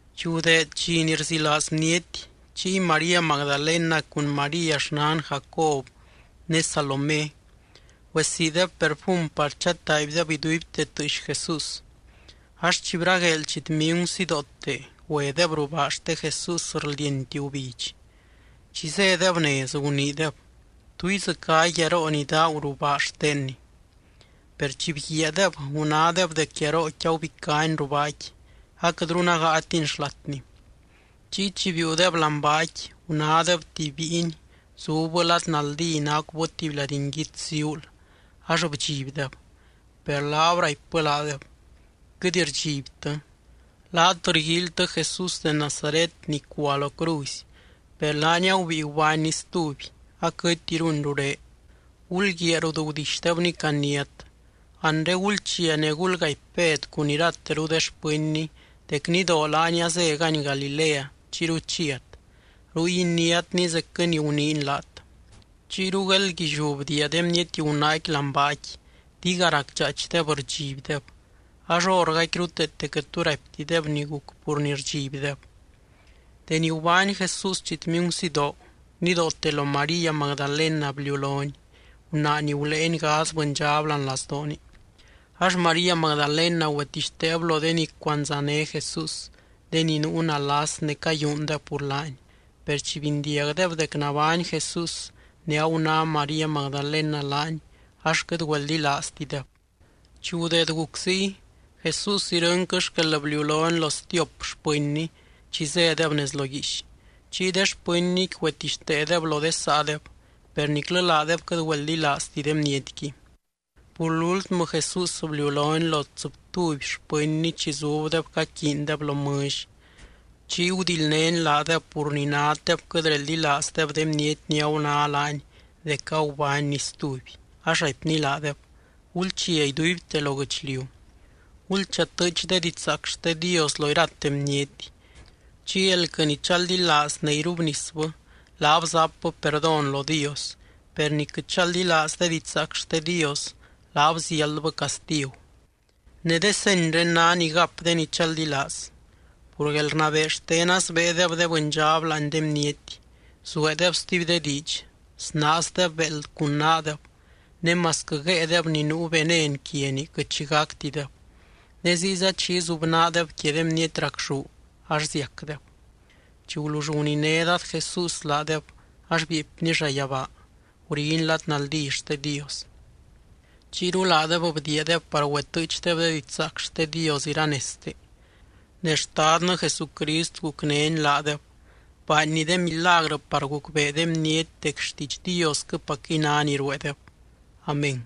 Chi gudeed dxi ni rzilaaz bniety, chiy María Magdalena cun María xnan Jacob ne Salomé, güesiideb perfum par chataaibdeb iduibte tɨɨx Jesús. Ax chi bragueel chitmingu sidoote güedeb ruu baa xte Jesús rldienti gubidx. Chi zédeb nez, guniideb: —¿Tú idzɨcá guiaroo ni daagu ruu baa xtenny? Per chi bguiaadeb, gunádeb dec guiarooqui agubicáni ruu baaqui, aquɨtru nágaatini xlatni. Chiy chi biiudeb láani baaqui, gunádeb tuby bíiny zubbɨ lad naldí, nacubɨ tuby lady nguits ziuul ax bdxibdeb. Per laab raipbɨ laadeb: —Quɨt rdxibtɨ. Laat rguíilytɨ Jesús de Nazaret ni cua lo cruzy. Per laany agubíi gubánny stuby. Aquɨtiruny ruré. Gulguiaa rut gudixdebny caniát. Anre gulchia ne gulgaipy Bed cun irateru de xpɨnny dec nidoo laany azégany Galilea chiyru chiat. Ruy iniátny, zecquɨ ni guniiny laat. Chiyru gueeldguilliú bdiia de bniety gunaaqui láani baaqui, diga racdxaaichdeb rdxibdeb. Ax hórgaqui ruteete quɨt tu raiptideb ni guc pur ni rdxibdeb. Deni gubány Jesús chitmingu sidoo, nidoote lo María Magdalena bliulony, gunaa ni guléeny gadz bɨndxab láani lazdooni. Ax María Magdalena güetixteeb lo de ni cuandzané Jesús, de ni nuu nalas ne cayúundeb pur laany. Per chi bindiagdeb dec nabány Jesús ne aguná María Magdalena laany, ax quɨt güeldilaaztideb. Chi gudeed guc ziy, Jesús irɨnquɨ xquel bliulony lo stiop xpɨnny chi zédeb nez lo guiix. Chiy de xpɨnnyqui güetixteedeb lo de saadeb, per niclɨ laadeb quɨt güeldilaazti de bnietqui. Pur lúltmɨ Jesús bliulony lo tsɨbtuby xpɨnny chi zubdeb caquiindeb lo mɨlly. Chiy gudildnény laadeb pur ni naddeb quɨt reldilaazdeb de bniety ni aguná laany dec agubánny stuby. Ax raipny laadeb: —Gulchia iduibte lo guɨchliu. Gulchatɨɨch de didxzaac xte Dios lo irate bniety. Chiy elquɨ ni chaldilaaz ne irubnisbɨ, laab zapbɨ perdón lo Dios. Per ni quɨt chaldilaaz de didxzaac xte Dios, laab ziáldbɨ castigu. Ne de senyré ná ni gap de ni chaldilaaz. Pur guelrnabee xtena sbéedeb de bɨndxab láani de bniety, zueedeb stuby de diidx, snaazdeb béeld cun naadeb ne masquɨ guéedeb ni nuu venen quiani quɨt xi gactideb. Ne ziyza chi izubnaadeb quia de bniety racxú ax ziacdeb. Chi gulull guniné Dad Jesús laadeb ax bieepny llayabaa, guriny lad naldí xte Dios. Chiyru laadeb bdiiadeb par güetɨɨchdeb de didxzaac xte Dios iranezte. Ne Xtadnɨ Jesucrist gucnény laadeb, baanny de milagrɨ par gucbee de bniety dec xtiidx Diosquɨpacquɨy ná ni rueedeb. Amén.